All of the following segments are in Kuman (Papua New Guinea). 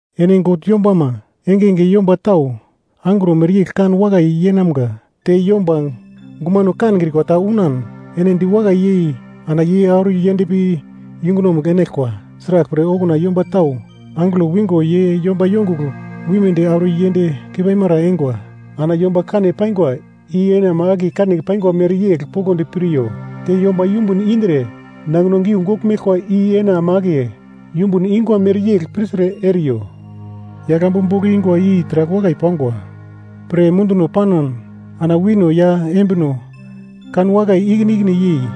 Ene God yombama engenge yomba tau angro mereyegl kan wakai yeinamga. Te yomba guma kankrikwa ta unan ene diwakai yei ana ye auro yendpi yungunomugl enaglkwa. Sraglpre okuna yomba tau angelo wingo ye yomba yongugl wimedi auro yend keipaimara eingwa. Ana yomba kane paingwa i ene ama akiye kane paingwa mereyegl poglodi piryo, te yomba yumbun indre nangino giugogl meglkwa i ene ama akiye yumbun ingwa mereyegl pirtre eriyo. Yaglambu bogl ingwa i taragl wakai pangwa pre munduno panan ana wino ya embino kanwakai ikine ikine yei,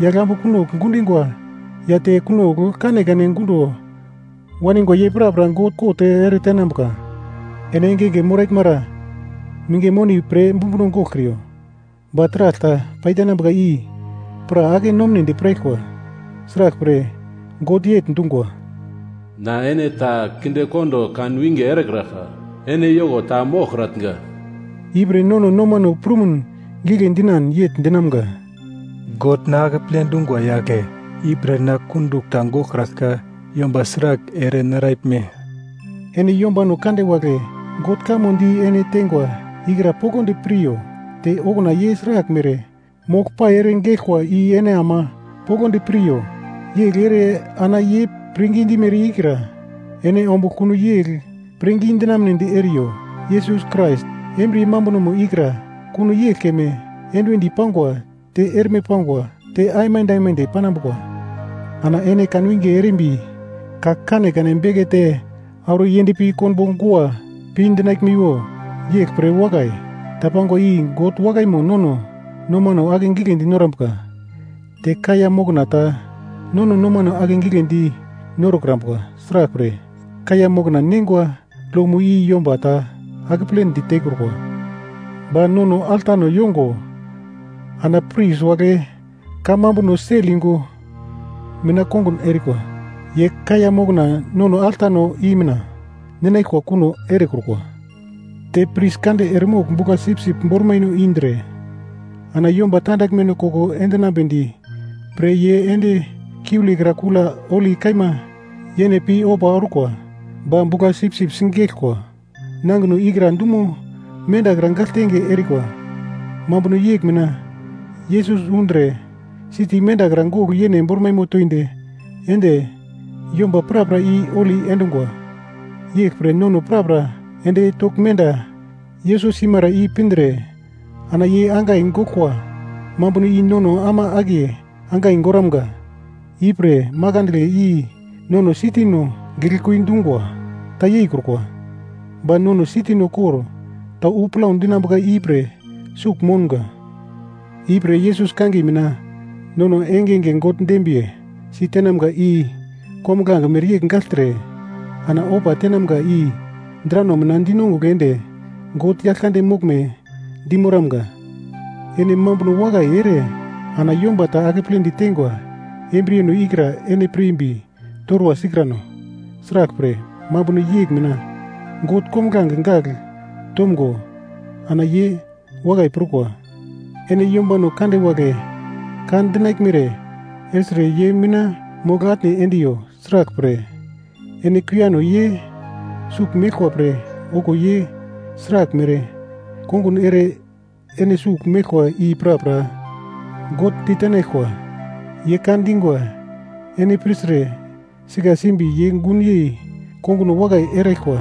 yaglambu kunogl gundingwa ya te kunogl kanekane gundo waningwa ye prapra God kot eretenambuka. Ene engenge moraglmara minge moni pre bumbuno goglkriyo, ba taragl ta paitenambuka i pra ake-nomedi piraglkwa. Sraglpre God yegl dungwa, “Na ene ta kindekondo kan winge erekraglka, ene yoko ta moglkratnga.” Ipre nono nomano prumuno gigle dinan yegl dinamga, “God na akeple dungwa yagle, ipre na kundugl ta goglkraglka yomba sragl ere naraglme?” Ene yombano kande wagle God kamo di ene tengwa ikra poglodi piryo. Te okuna ye sraglmere moglpai ere geglkwa i ene ama poglodi piryo, yegl ere ana ye pirngi dimere ikra ene ombugl kuno yegl pirngi dinamedi eriyo. Yesus Krais embriye mambunomo ikra kuno yegl keme enduwendi pangwa, te erme pangwa te aimande aimande panambuka. Ana ene kanwinge erimbi ka kanekane bekete auro yendpi konbo gua pi dinaglmiwo. Yeglpre wakai ta pangwa i God wakaimo nono nomano ake giglendi norambuka, te kaiya mokna ta nono nomano akegiglendi norokrambuka, sraglpre, kaiya mokna neingwa lomo i yomba ta akeple ditekrukwa. Ba nono altano yongo, ana pris wagle kamambuno sel yungu mina kongun erikwa, ye kaiya mokna nono altano i mina ninaglkwa kuno erekrukwa. Te pris kande eremogl bugla-sipsip bormaino indre ana yomba tandaglmeno koko enambedi pre ye ende kiulekra Kula Holi Kaima Yene pi ofa orkwa, ba bugla-sipsip sigeglkwa nangino ikra dumo mendakra gagltenge erikwa. Mambuno yegl mina Yesus undre siti mendakra gogl yene bormaimo toindi ende yomba prapra i holi endungwa. Yeglpre nono prapra ende togl menda Yesus simara i pindre ana ye angai goglkwa mambuno i nono ama akiye angai goramga. Ipre manginagle i nono sitino giglekui dungwa ta yeikrukwa, ba nono siti kor ta wu plau dinambuka ipre sugl mounga. Ipre Yesus kangiye mina nono engenge God dembiye si tenamga i kombuglange mereyegl gagltre ana ofa tenamga i drano mina dinongugl ende God Yaglkande moglme dimoramga. Ene mambuno wakai ere ana yomba ta akeple ditengwa embriyeno ikra ene pirmbi torwa sikrano, sraglpre, mambuno yegl mina God kombuglange gagl tomgo ana ye wakai prukwa. Ene yombano kande wagle ka dinaglmere ertre ye mina mogl-atne endiyo, sraglpre, ene kuiyano ye sugl meglkwa pre okuwo ye sraglmere kongun ere ene sugl meglkwa i prapra God ditenaglkwa. Ye ka dingwa ene pirtre sika simbi ye gunyei konguno wakai eraglkwa,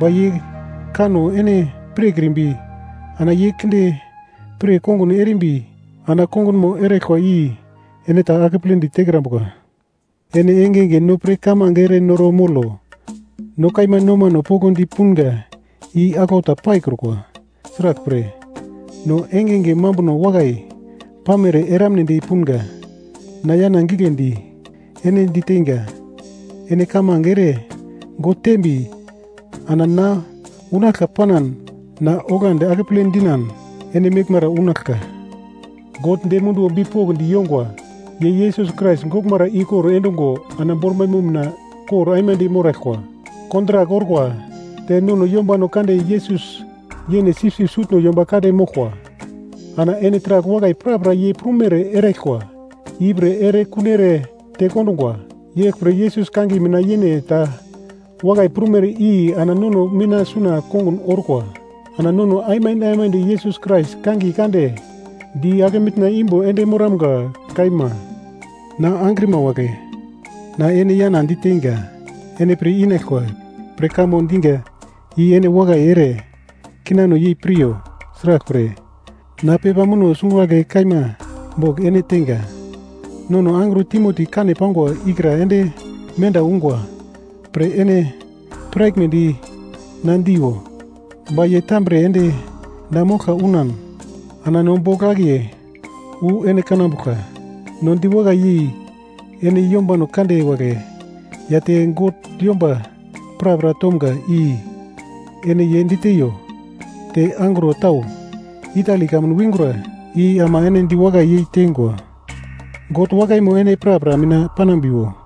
ba ye kanno ene pirkrimbi ana ye kinde pir kongun erimbi ana kongunmo eraglkwa i ene ta akeple ditekrambuka. Ene engenge no pre kamange erenoro molo. No kaima nomano poglodi punga i aglau ta paikrukwa, sraglpre, no engenge mambuno wakai pamere eramnedi punga. Na yana giglendi ene diteinga, ene kamange ere God tembi ana na unaglka panan na oglandi akeple dinan ene meglmara unaglka. God dem munduwo bipokndi yongwa. Ye Yesus Krais goglmara ikor endungo ana bormaimo mina kor aimande moraglkwa kontrak orkwa, te nono yombano kande Yesus yene sipsip Sutno Yomba Kande moglkwa. Ana ene taragl wakai prapra ye prumere eraglkwa ipre ene erekun ere tekondungwa, yeglpre Yesus kangiye mina yene ta wakai prumere i ana nono mina suna kongun orkwa. Ana nono aimande aimande Yesus Krais kangiye kande di ake mitna imbo ende moramga. Kaima. Na angrima wagle, na ene yana diteinga, ene pir inaglkwa pre kamo diga i ene wakai ere kinano yei piryo, sraglpre, na pepa muno sungagle kaima bogl ene teinga. Nono angro Timoti kane pangwa ikra ende menda ungwa pre ene piraglmedi na diiwo. Ba ye tambre ende na moglka unan ana no bogl akiye wu ene kanambuglka. No diwakai yei ene yombano kande wagle ya te God yomba prapra tomga i ene ye diteiyo. Te angro tau Itali kamun wingra i ama ene diwakai yei tengwa. God wakaimo ene prapra mina panambiwo.